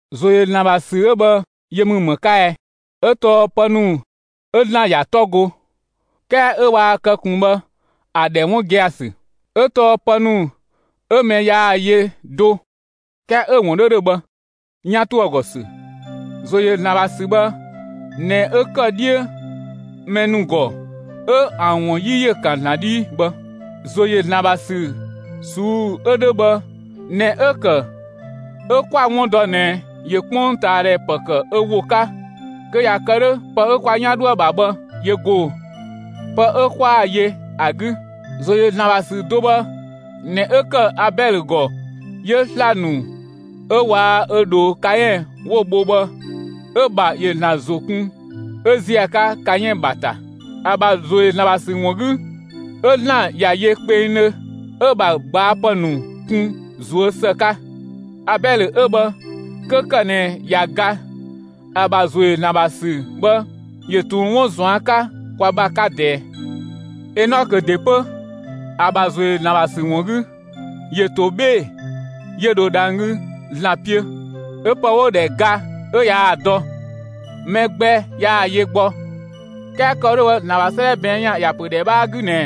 ‑Zo yö ‑Zlan ‑bha ‑sü 'ö bhë, yö ‑mü ‑më 'ka ɛ? 'Ö tɔɔ pë ‑nu 'ö ‑Zlan ‑ya 'tɔ go, 'kɛɛ 'ö waa kë ꞊kun bhë ‑a ‑dhɛ 'wun gia‑ ‑sü; 'ö tɔɔ pë ‑nu 'ö mɛ yaa‑ yö do ('kɛɛ 'ö‑ ‑wun 'dhö ‑dhö) bhë, 'yan ‑to ‑a ‑gɔ ‑sü. ‑Zo ‑yö ‑Zlan ‑bha ‑sü bhë ꞊nɛ 'ö ‑kë 'dhiö mɛ ‑nu ‑gɔ 'ö ‑an ‑wun 'yi ‑yö ‑kan ‑Zlan 'dhii bhë. ‑Zo ‑yö ‑Zlan ‑bha ‑sü ꞊suu'‑ 'ö 'dhö bhë ꞊nɛ 'ö‑ ‑kë 'ö 'kwa‑ 'wun dɔ ꞊nɛ ‑yö 'kpongtaadhɛ ‑pë ‑kë ö ‑wo 'ka; kö ꞊ya kë 'dhö pë 'ö kwa 'yan 'dhoë‑ ‑bha bhë ‑yö ‑go pë 'ö 'kwaa‑ yö ‑a 'gü. ‑Zo ‑yö ‑Zlan ‑bha ‑sü do bhë ꞊nɛ 'ö ‑kë Abɛlö ‑gɔ 'yö sla‑ ‑nu 'ö waa‑ ö ꞊dhoo Kaɛn 'wo‑ bho bhë, 'ö‑ ‑bha ‑yö ‑Zlan ‑zo kun 'ö ‑ziö ‑a 'ka Kaɛn ‑bha ‑ta. ‑A ‑bha ‑zo ‑yö ‑Zlan ‑bha ‑sü ‑wun 'gü, 'yö ‑Zlan ‑ya yö kpengdhö, 'ö‑ ‑bha gbaɔpë ‑nu kun ꞊zuö' ‑së 'ka. Abɛlö 'ö bhë 'kö ‑kë ꞊nɛ ꞊ya ga, ‑a ‑bha ‑zo ‑yö ‑Zlan ‑bha ‑sü bhë ‑yö ꞊tun 'wun ꞊zuan' 'ka kwa ‑bha 'ka ꞊dɛɛ. Enɔkö ‑de 'pö, ‑a ‑bha ‑zo ‑yö ‑Zlan ‑bha ‑sü ‑wun 'gü, ‑yö ‑to 'bhee‑, 'yö dho dhang‑ 'gü ‑Zlan 'piö; 'ö pë 'wo‑ ‑dhɛ ‑ga 'ö yaa‑ dɔ. Mɛ gbɛ yaa‑ yö gbɔ. 'Kɛɛ kë‑ wo 'dhö bhë, ‑Zlan ‑bha 'sëëdhɛ ꞊bɛɛn' ‑yan ‑ya ‑pö ‑dhɛ 'bhaa 'gü mü ꞊nɛ: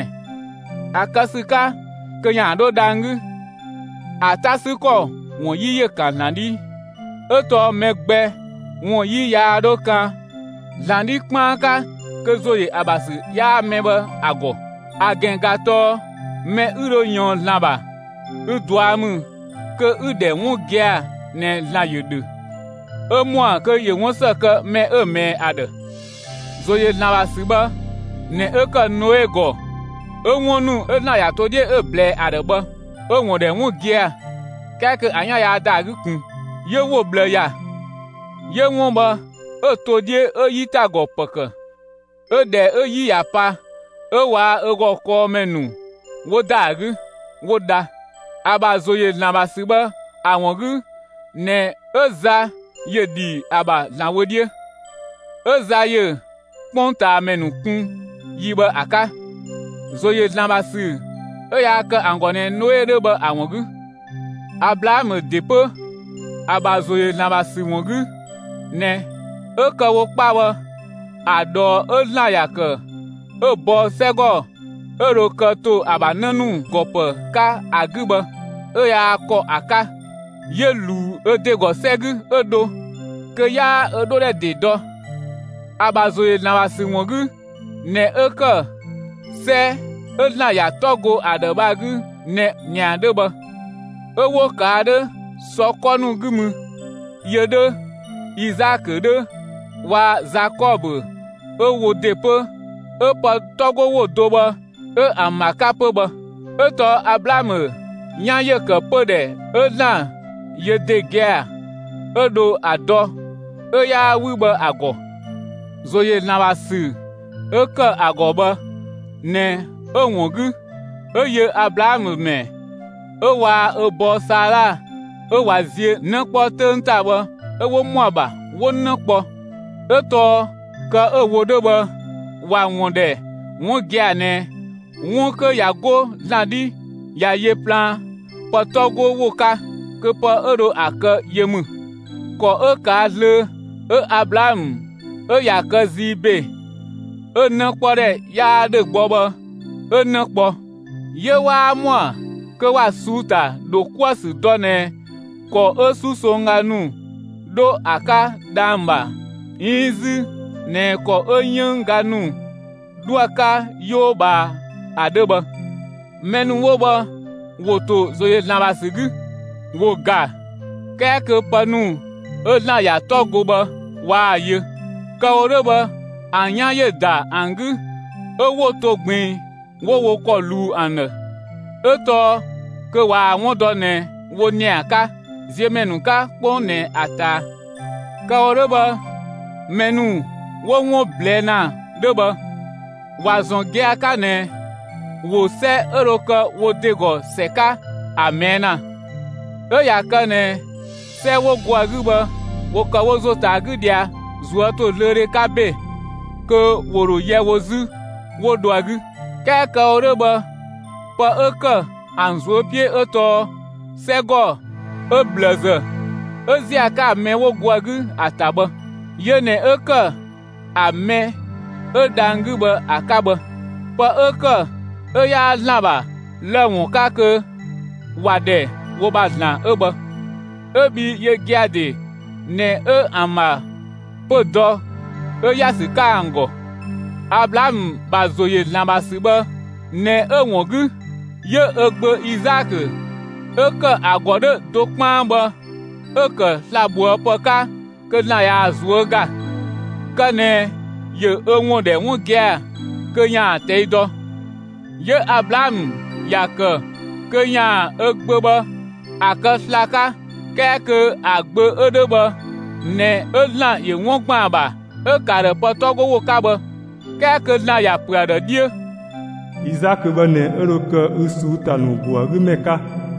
‑A kë ‑sü 'ka kö ‑yaan 'dho dhang‑ 'gü, ‑a 'ta ‑sü ‑kɔ ‑wun 'yi ‑yö ‑kan ‑Zlan 'dhii. 'Ö tɔɔ mɛ gbɛ ‑wun 'yi yaa 'dhö kan ‑Zlan 'dhi 'kpaan 'ka kö ‑zo ‑yö ‑a ‑bha ‑sü 'yaa mɛ bhë ‑a ‑gɔ. ‑A ‑gɛn ꞊ga tɔɔ mɛ 'ü dho ꞊yɔɔn ‑Zlan ‑bha, ü ꞊dua' ‑mü kö 'ü‑ ‑dhɛ 'wun gia‑ ꞊nɛ ‑Zlan ‑yö ‑dhö; 'ö ‑mɔa kö ‑yö 'wun ‑së kë mɛ 'ö‑ ꞊mɛɛ ‑a ‑dhë. ‑Zo ‑yö ‑Zlan ‑bha ‑sü bhë ꞊nɛ 'ö ‑kë Noe ‑gɔ 'ö 'wun ‑nu 'ö ‑Zlan ‑ya to 'dhiö 'ö‑ ꞊blɛɛ ‑a ‑dhë bhë, 'ö‑ ‑wun ‑dhɛ 'wun gia‑ 'kɛɛ kö ‑a 'yan yaa ‑da ‑a 'gü ꞊kun. 'Yö‑ ‑wo ꞊bhlë ‑ya; 'yö 'wun bhë 'ö‑ to 'dhiö 'ö 'yitagɔ ‑pë ‑kë; 'ö ‑dhɛ 'ö 'yi ꞊ya pa, 'ö waa‑ ö ‑gɔ kɔɔmɛ ‑nu 'wo ‑da ‑a 'gü, 'wo dha. ‑A ‑bha ‑zo ‑yö ‑Zlan ‑bha ‑sü bhë ‑a ‑wun 'gü ꞊nɛ 'ö za ‑yö ‑dhi ‑a ‑bha ‑Zlan wö 'dhiö, 'ö za ‑yö 'kpongtaamɛ ‑nu kun yi bhë ‑a 'ka, ‑zo ‑yö ‑Zlan ‑bha ‑sü 'ö yaa kë ‑an ‑gɔ ꞊nɛ Noe 'dhö bhë ‑a ‑wun 'gü. Ablaamö ‑de 'pö, ‑a ‑bha ‑zo ‑yö ‑Zlan ‑bha ‑sü ‑wun 'gü ꞊nɛ, 'ö kë‑ wo 'kpa bhë, ‑a ꞊dhɔɔ 'ö ‑Zlan ‑ya ‑kë 'ö‑ bɔ 'sɛgɔ 'ö dho kë ‑to ‑a ‑bha 'në ‑nu ‑gɔ ‑pë 'ka ‑a 'gü bhë, 'ö yaa ‑kɔ ‑a 'ka. 'Yö ꞊luu ö ‑de ‑gɔ 'sɛ 'gü 'ö dho, kö 'yaa ö 'dhodhɛ ‑de dɔ. ‑A ‑bha ‑zo ‑yö ‑Zlan ‑bha ‑sü ‑wun 'gü ꞊nɛ 'ö ‑kë 'sɛ 'ö ‑Zlan ꞊ya 'tɔ go ‑a ‑dhë bhë ‑a 'gü ꞊nɛ ‑nia 'dhö bhë; 'ö 'wo ꞊kaa' 'dhö sɔ 'kɔ ‑nu 'gü mü yö 'dhö, Izaakö 'dhö waa‑ Zakɔbö 'ö wo ‑de 'pö 'ö pë 'tɔ 'go ‑wo do bhë 'ö ‑an ‑bha 'ka 'pö bhë. 'Ö tɔɔ Ablaamö 'yan ‑yö ‑kë pödhɛ 'ö ‑Zlan yö ‑de gia‑ 'ö dho ‑a dɔ, 'ö 'yaa 'wü bhë ‑a ‑gɔ. ‑Zo ‑yö ‑Zlan ‑bha ‑sü 'ö ‑kë ‑a ‑gɔ bhë ꞊nɛ 'ö‑ ‑wun 'gü 'ö yö Ablaamö ‑mɛ, 'ö waa‑ ö bɔɔ Saala 'ö ꞊wa ziö 'në 'kpɔ 'töng ‑ta bhë 'ö 'wo ‑mɔa ‑bha 'wo 'në kpɔ. 'Ö tɔɔ kë 'ö‑ wo 'dhö bhë ‑wa ‑wun ‑dhɛ 'wun gia‑ ꞊nɛ 'wun 'kö ꞊ya 'go ‑Zlan 'dhi ꞊ya yö plaan pë 'tɔ 'go ‑wo 'ka, kö pë 'ö dho ‑a kë yö ‑mü. ‑Kɔ 'ö ꞊kaa' zlöö 'ö Ablaamö 'ö ꞊ya kë zii ‑be, 'ö‑ 'nëkpɔdhɛ 'yaa ‑dhö gbɔ bhë 'ö 'në kpɔ, 'yö 'waa ‑mɔa kö ‑wa ꞊suu'‑ ‑ta ‑dho 'kuë‑ ‑sü dɔ ꞊nɛ ‑kɔ 'ö 'susongga ‑nu 'dho ‑a 'ka dhang‑ ‑bha 'iin 'zü ꞊nɛ ‑kɔ 'ö 'yënng ga ‑nu 'dhoë‑ 'ka 'yoo ꞊bhaa ‑a 'dhö bhë. Mɛ ‑nu 'wo bhë ‑wo ‑to ‑zo ‑yö ‑Zlan ‑bha ‑sü 'gü, ‑wo ‑ga, 'kɛɛ kö pë ‑nu 'ö ‑Zlan ‑ya 'tɔ go bhë waa‑ yö; kë‑ wo 'dhö bhë ‑an 'yan ‑yö ‑da ‑an 'gü 'ö 'wo to ꞊gbiin 'wo wo ‑kɔ ꞊luu ‑an ‑dhë; 'ö tɔɔ kö ꞊waa‑ 'wun dɔ ꞊nɛ wo ‑nia 'ka, ziö ‑mɛ ‑nu 'ka 'kpong ꞊nɛ ‑a ꞊taa. Kë‑ wo 'dhö bhë mɛ ‑nu 'wo 'wun ꞊blɛɛ' ‑na 'dhö bhë, ‑wa ‑zɔn gia‑ 'ka ꞊nɛ ‑wo 'sɛ 'ö dho kë wo ‑de ‑gɔ ‑sɛ 'ka ‑a ꞊mɛɛ' ‑na. 'Ö ꞊ya kë ꞊nɛ 'sɛ 'wo go ‑a 'gü bhë ‑wo ‑kë wo ‑zo ‑ta ‑a 'gü ꞊dhia ꞊zuötozlöödhe 'ka ‑be, kö ‑wo ‑dho yɛ wo 'zü, 'wo dho ‑a 'gü. 'Kɛɛ kë‑ wo 'dhö bhë pë 'ö ‑kë ‑an ꞊zuö' 'piö 'ö tɔɔ 'sɛgɔ 'ö ꞊bhlëzë 'ö ‑ziö ‑a 'ka ‑a mɛ 'wo go ‑a 'gü ‑a ‑ta bhë. Yö ꞊nɛ 'ö ‑kë ‑a mɛ 'ö dhang‑ 'gü bhë ‑a 'ka bhë. Pë 'ö ‑kë 'ö 'yaa ‑Zlan ‑bha lë‑ ‑wun 'ka kö ‑wa ‑dhɛ wo ‑bha ‑Zlan 'ö bhë 'ö bhii yö gia‑ ‑de ꞊nɛ 'ö ‑an ‑bha pö‑ dɔ 'ö ‑ya ‑sü 'ka ‑an ‑gɔ. Ablaamö ‑bha ‑zo ‑yö ‑Zlan ‑bha ‑sü bhë ꞊nɛ 'ö‑ ‑wun 'gü, 'yö ö gbö Izaakö 'ö ‑kë ‑a ‑gɔ 'dhö do 'kpaan bhë 'ö‑ ‑kë slabhoëpë 'ka kö ‑Zlan ꞊yaa‑ ꞊zuö' ‑ga, kë ꞊nɛ ‑yö ö ‑wun ‑dhɛ 'wun gia‑ kö ‑yaan ꞊tɛi' dɔ. 'Yö Ablaamö ‑ya ‑kë kö ‑yaan ö gbö bhë ‑a kë sla‑ 'ka 'kɛɛ kö ‑a gbö 'ö 'dhö bhë ꞊nɛ 'ö ‑Zlan ‑yö 'wun ‑gban ‑a ‑bha 'ö‑ ‑kë ‑a ‑dhë pë 'tɔ go ‑wo 'ka bhë. 'Kɛɛ kö ‑Zlan ‑ya ‑pö ‑a ‑dhë 'dhiö: Izaakö bhë ꞊nɛ 'ö dho kë ü ꞊suu'‑ ‑ta ‑nu ‑go ‑a 'gü ‑mɛ 'ka.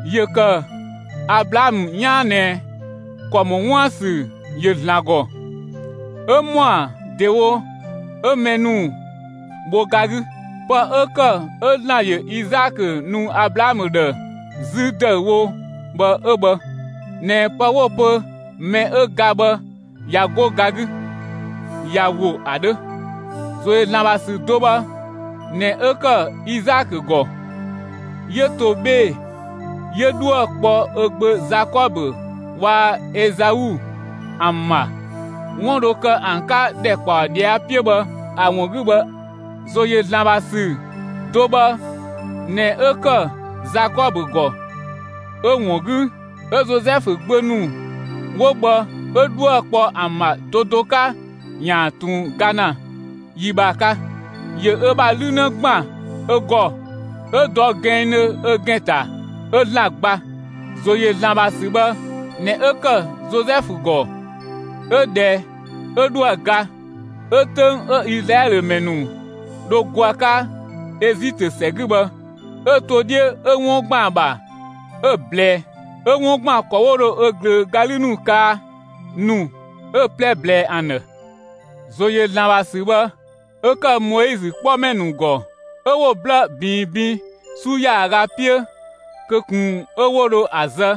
‑Yö ‑kë Ablaamö 'yaan ꞊nɛ ‑kɔ ‑mɔ 'wuën‑ ‑sü ‑yö ‑Zlan ‑gɔ, 'ö ‑mɔa ‑dewo 'ö mɛ ‑nu bho ga 'gü. Pë 'ö ‑kë 'ö ‑Zlan ‑yö Izaakö nu Ablaamö ‑dhë 'zü ‑dëüwo bhë 'ö bhë ꞊nɛ pë 'wo‑ pö mɛ 'ö ga bhë ꞊ya 'go ga 'gü, ꞊ya ‑wo ‑a 'dhö. ‑Zo ‑yö ‑Zlan ‑bha ‑sü do bhë ꞊nɛ 'ö ‑kë Izaakö ‑gɔ, 'yö to 'bhee‑, 'yö 'dhuë‑ kpɔ ö gbö Zakɔbö waa‑ Ezau ‑an ‑bha 'wun dho kë ‑an 'ka ‑dhɛkpaɔ ꞊dhia' 'piö bhë ‑a ‑wun 'gü bhë. ‑Zo ‑yö ‑Zlan ‑bha ‑sü do bhë ꞊nɛ 'ö ‑kë Zakɔbö ‑gɔ, 'ö‑ ‑wun 'gü 'ö Zozɛfu gbö ‑nu 'wo bhë 'ö 'dhuë‑ kpɔ ‑an ‑bha do do 'ka ‑yaan ꞊tun ga ‑na; yi bhë ‑a 'ka, ‑yö ö ‑bha 'lü 'në ‑gban ö ‑gɔ 'ö dɔ gɛnngdhö ö ‑gɛn ‑ta 'ö ‑Zlan gba. ‑Zo ‑yö ‑Zlan ‑bha ‑sü bhë ꞊nɛ 'ö ‑kë Zozɛfu ‑gɔ 'ö ꞊dhɛ 'ö 'dhoë‑ ga, 'ö 'töng 'ö Izlaɛlö ‑mɛ ‑nu dho go ‑a 'ka Ezitö ‑sɛ 'gü bhë 'ö‑ to 'dhiö 'ö 'wun ‑gban ‑a ‑bha 'ö‑ ꞊blɛɛ; 'ö 'wun ‑gban ‑kɔ 'wo dho ö ꞊glöö ga 'lü ‑nu kaa ‑nu 'ö‑ 'plɛ ꞊blɛɛ ‑an ‑dhë. ‑Zo ‑yö ‑Zlan ‑bha ‑sü bhë 'ö ‑kë Moizö 'kpɔmɛ ‑nu ‑gɔ 'ö 'wo‑ 'blë ꞊biin bin 'su ‑yaaga 'piö kö ꞊kun 'ö 'wo dho ‑a zë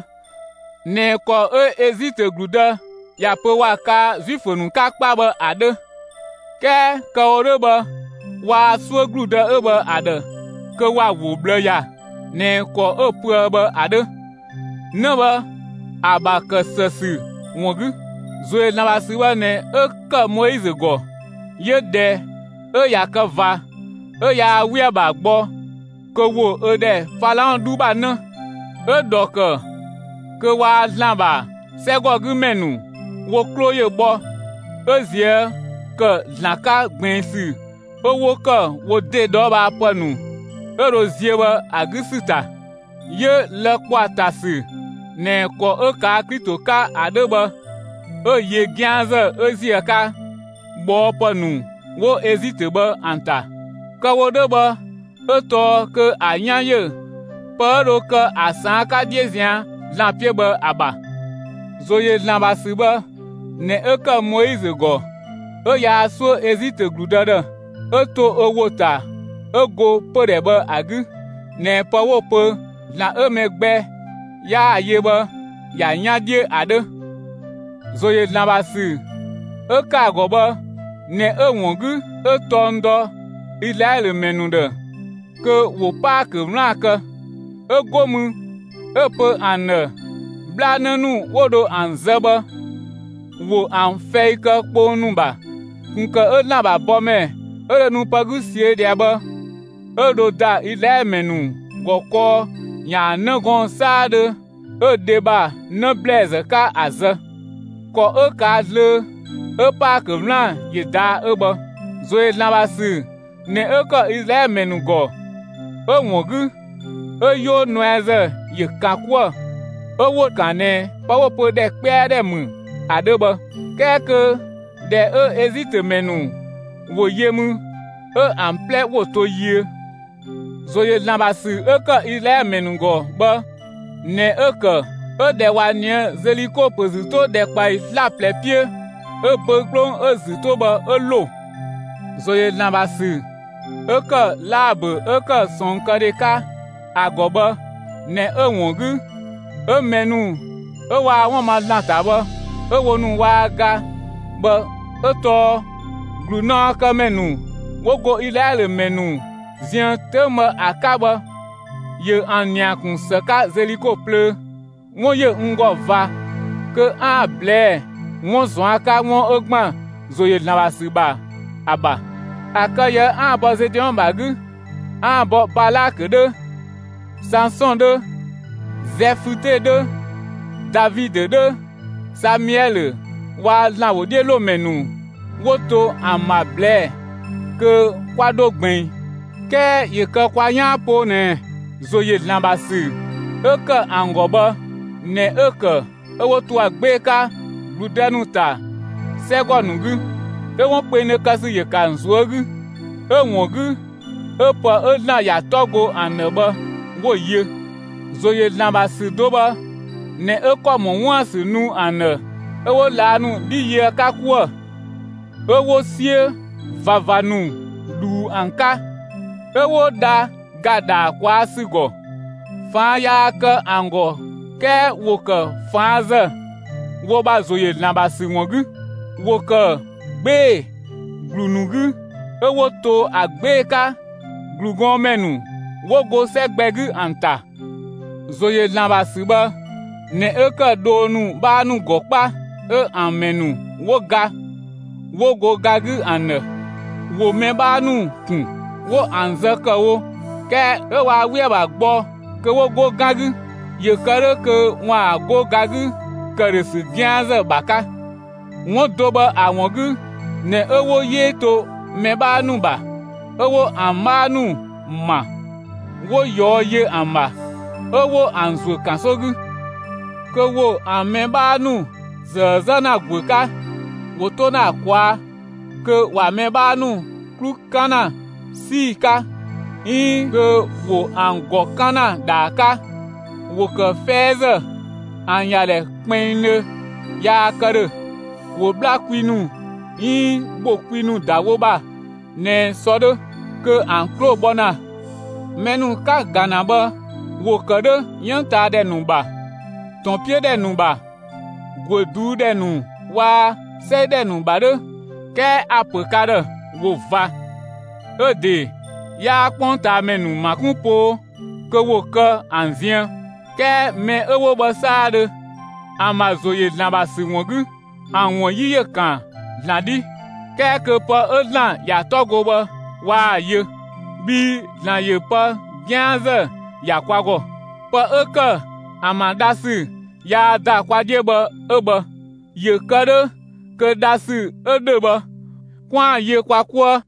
(꞊nɛ ‑kɔ 'ö Ezitö ‑gludë ‑ya pö ‑wa kaa Zuifö 'ka 'kpa bhë ‑a 'dhö); 'kɛɛ kë‑ wo 'dhö bhë, waa 'suö ‑gludë 'ö bhë ‑a ‑dhë kö ‑wa ‑wo ꞊bhlë ‑ya ꞊nɛ ‑kɔ 'ö‑ pöë bhë ‑a 'dhö 'në bhë ‑a ‑bha ‑kë ‑së ‑sü ‑wun 'gü. ‑Zo ‑yö ‑Zlan ‑bha ‑sü bhë ꞊nɛ 'ö ‑kë Moizö ‑gɔ; 'yö ꞊dhɛ 'ö ꞊ya kë ꞊va, 'ö yaa 'we ‑a ‑bha gbɔ kö ‑wo ö ‑dhɛ Falaɔn 'dhu ‑bha 'në. 'Ö‑ ‑dhɔ ‑kë kö waa‑ ‑Zlan ‑bha 'sɛgɔgümɛ ‑nu wo 'klo ‑yö bhɔ 'ö ꞊zië' ‑kë ‑Zlan 'ka ꞊gbiin ‑sü 'ö 'wo ‑kë wo ‑de ꞊dhɔɔbhaapë ‑nu 'ö dho ziö bhë ‑a 'gü ‑sü ‑ta. 'Yö lë‑ ‑kpɔ ‑a ‑ta ‑sü ꞊nɛ ‑kɔ 'ö ꞊kaa' Klito 'ka ‑a 'dhö bhë, 'ö‑ yö 'gianzë 'ö ‑ziö ‑a 'ka ꞊bhɔɔpë ‑nu 'wo Ezitö bhë ‑an ‑ta. Kë‑ wo 'dhö bhë 'ö tɔɔ kö ‑a 'yan ‑yö pë 'ö dho kë ‑a ꞊saan' 'ka 'dhiö ꞊zian' ‑Zlan 'piö bhë ‑a ‑bha. ‑Zo ‑yö ‑Zlan ‑bha ‑sü bhë ꞊nɛ 'ö ‑kë Moizö ‑gɔ 'ö yaa 'suö Ezitö ‑gludë ‑dhë; 'ö to ö ‑wo ‑ta 'ö go pödhɛ bhë ‑a 'gü ꞊nɛ pë 'wo‑ pö ‑Zlan 'ö mɛ gbɛ 'yaa‑ yö bhë, ‑ya 'yan 'dhiö ‑a 'dhö. ‑Zo ‑yö ‑Zlan ‑bha ‑sü 'ö ‑kë ‑a ‑gɔ bhë ꞊nɛ 'ö‑ ‑wun 'gü 'ö tɔng dɔ Izlaɛlö ‑mɛ ‑nu ‑dhë kö ‑wo Paakö 'wlaan‑ kë; 'ö 'go mü 'ö‑ pö ‑an ‑dhë 'bhlanë ‑nu 'wo dho ‑an zë bhë, ‑wo ‑an fɛi kë kpong ‑nu ‑bha ꞊kun ‑kë 'ö ‑Zlan ‑bha bɔmɛ 'ö dho nu pë 'gü ꞊siö' ꞊dhia bhë 'ö dho ‑da Izlaɛlö ‑mɛ ‑nu ‑gɔ kɔɔ ‑yaan 'në gɔɔn‑ 'saadhö 'ö dhe ‑bha 'në ‑blɛɛzë 'ka ‑a zë. (‑Kɔ 'ö ꞊kaa' zlöö 'ö Paakö 'wlaan‑ ‑yö ꞊daa' 'ö bhë.) ‑Zo ‑yö ‑Zlan ‑bha ‑sü ꞊nɛ 'ö ‑kë Izlaɛlö ‑mɛ ‑nu ‑gɔ 'ö‑ ‑wun 'gü, 'ö 'Yoo nuɛazë ‑yö ‑kan 'kuë‑ 'ö 'wo‑ ‑kan ꞊nɛ pë 'wo‑ pö ‑dhɛ 'kpɛa ‑dhɛ ‑mü ‑a 'dhö bhë, 'kɛɛ kö ꞊dhɛ 'ö Ezitö ‑mɛ ‑nu ‑wo yö mü 'ö ‑an 'plɛ ‑wo to yiö. ‑Zo ‑yö ‑Zlan ‑bha ‑sü 'ö ‑kë Izlaɛlö ‑mɛ ‑nu ‑gɔ bhë ꞊nɛ 'ö‑ ‑kë 'ö ꞊dhɛ 'ö ꞊wa ꞊nië' Zeliko ‑pö ‑zü 'to ‑dhɛkpaɔyi 'slaplɛ 'piö 'ö‑ böü‑ 'kplong 'ö‑ ‑zü 'to bhë, 'ö ‑lo. ‑Zo ‑yö ‑Zlan ‑bha ‑sü 'ö ‑kë Laabö 'ö ‑kë ꞊sɔɔnkëdhe 'ka ‑a ‑gɔ bhë ꞊nɛ 'ö‑ ‑wun 'gü 'ö mɛ ‑nu 'ö waa 'wun ma ‑Zlan ‑ta bhë 'ö wo ‑nu waa ga bhë 'ö tɔɔ ‑glunaɔkëmɛ ‑nu 'wo go Izlaɛlö ‑mɛ ‑nu ziën 'töng bhë ‑a 'ka bhë, ‑yö ‑an ‑nia ‑kun ‑së 'ka Zeliko plöö. 'Wun ‑yö n ‑gɔ ꞊va kö 'aan‑ ꞊blɛɛ' 'wun ꞊zuan' 'ka 'wun 'ö ‑gban ‑zo ‑yö ‑Zlan ‑bha ‑sü ‑bha ‑a ‑bha; ‑a kë ꞊yië' 'aan‑ bɔ Zedeɔn ‑bha 'gü, 'aan‑ bɔ Balakö 'dhö, Sansɔn 'dhö, Zɛfüte 'dhö, Davidö 'dhö, Samiɛlö waa‑ ‑Zlan ‑wodhiölomɛ ‑nu 'wo to ‑an ‑bha ꞊blɛɛ'‑, kö 'kwa 'dho ꞊gbiin. 'Kɛɛ ‑yö kë kwa 'yaan poo ꞊nɛ ‑zo ‑yö ‑Zlan ‑bha ‑sü 'ö ‑kë ‑an ‑gɔ bhë ꞊nɛ 'ö‑ ‑kë 'ö 'wo to ‑a 'gbee‑ 'ka ‑gludë ‑nu ‑ta 'sɛgɔ ‑nu 'gü, 'ö 'wun kpengdhö kë ‑sü ‑yö ‑kë ‑an ꞊zuö' 'gü; 'ö‑ ‑wun 'gü 'ö pë 'ö ‑Zlan ‑ya 'tɔ go ‑an ‑dhë bhë, 'wo‑ yö. ‑Zo ‑yö ‑Zlan ‑bha ‑sü do bhë ꞊nɛ 'ö ‑kɔ ‑mɔ 'wuën‑ ‑sü nu ‑an ‑dhë 'ö 'wo ꞊laa' ‑nu 'dhi yö ‑a 'ka 'kuë‑, 'ö 'wo 'siö ꞊vava ‑nu ꞊dhuu ‑an 'ka, 'ö 'wo dha ‑ga ‑dhaa ꞊kwaa' ‑sü ‑gɔ. ꞊Faan' yaa kë ‑an ‑gɔ 'kɛɛ ‑wo ‑kë ꞊faan' ‑zë (wo ‑bha ‑zo ‑yö ‑Zlan ‑bha ‑sü ‑wun 'gü). ‑Wo ‑kë 'gbee‑ ‑glu ‑nu 'gü 'ö 'wo to ‑a 'gbee‑ 'ka ‑glugɔnmɛ ‑nu 'wo go 'sɛ gbɛ 'gü ‑an ‑ta. ‑Zo ‑yö ‑Zlan ‑bha ‑sü bhë ꞊nɛ 'ö ‑kë dhoo ‑nu 'bhaa ‑nu ‑gɔ 'kpa, 'ö ‑an ‑mɛ ‑nu 'wo ga, 'wo go ga 'gü ‑an ‑dhë. ‑Wo mɛ 'bhaa ‑nu ‑kun, 'wo ‑an zë ‑kë wo 'kɛɛ 'ö waa 'we ‑a ‑bha gbɔ kö 'wo 'go 'gan 'gü, ‑yö kë 'dhö kö ‑waan 'go ga 'gü ‑këdhösü 'gianzë ‑bha 'ka. 'Wun do bhë ‑a ‑wun 'gü ꞊nɛ 'ö 'wo 'yee to mɛ 'bhaa ‑nu ‑bha, 'ö 'wo ‑an 'bhaa ‑nu ‑ma, 'wo ꞊yɔɔ' yö ‑an ‑bha, 'ö 'wo ‑an ‑zuö ‑kanso 'gü, kö ‑wo ‑an mɛ 'bhaa ‑nu ꞊zëë 'zë ‑na ‑guö 'ka, ‑wo 'to ‑na ‑a ꞊kwaa' kö ‑wa mɛ 'bhaa ‑nu 'klu 'kan ‑na 'sii‑ 'ka 'iin kö ‑wo ‑an ‑gɔ 'kan ‑na ‑dhaa 'ka; ‑wo ‑kë 'fɛɛzë; ‑an ‑ya ‑dhɛ kpinngdhö yaa kë ‑dhö; ‑wo 'bhla kwi ‑nu 'iin ‑bho kwi ‑nu ‑da wo ‑bha ꞊nɛ sɔ 'dhö; kö ‑an 'klo bhɔ ‑na. Mɛ ‑nu 'ka‑ ‑ga ‑na bhë, ‑wo ‑kë 'dhö 'yënng ꞊taa ‑dhɛ ‑nu ‑bha, ‑tɔn 'piö ‑dhɛ ‑nu ‑bha, ‑guö ꞊duu' ‑dhɛ ‑nu waa‑ 'sɛi ‑dhɛ ‑nu ‑bha 'dhö, 'kɛɛ a‑ ‑pö ka ‑dhë ‑wo ꞊va 'ö‑ ‑de 'yaa 'kpongtaamɛ ‑nu ‑ma 'kun poo kö ‑wo kë ‑an ziën. 'Kɛɛ mɛ 'ö 'wo bhë 'saadhö, ‑an ‑bha ‑zo ‑yö ‑Zlan ‑bha ‑sü ‑wun 'gü, ‑an ‑wun 'yi ‑yö ‑kan ‑Zlan 'dhi, 'kɛɛ kö pë 'ö ‑Zlan ‑ya 'tɔ go bhë, waa‑ yö. Bhii ‑Zlan ‑yö pë 'gianzë ‑ya kwa ‑gɔ. Pë 'ö ‑kë ‑an ‑bha dhasü yaa ‑da kwa 'dhiö bhë 'ö bhë, ‑yö kë 'dhö kö dhasü 'ö ‑dhö bhë 'kwaan‑ yö kwa 'kuë.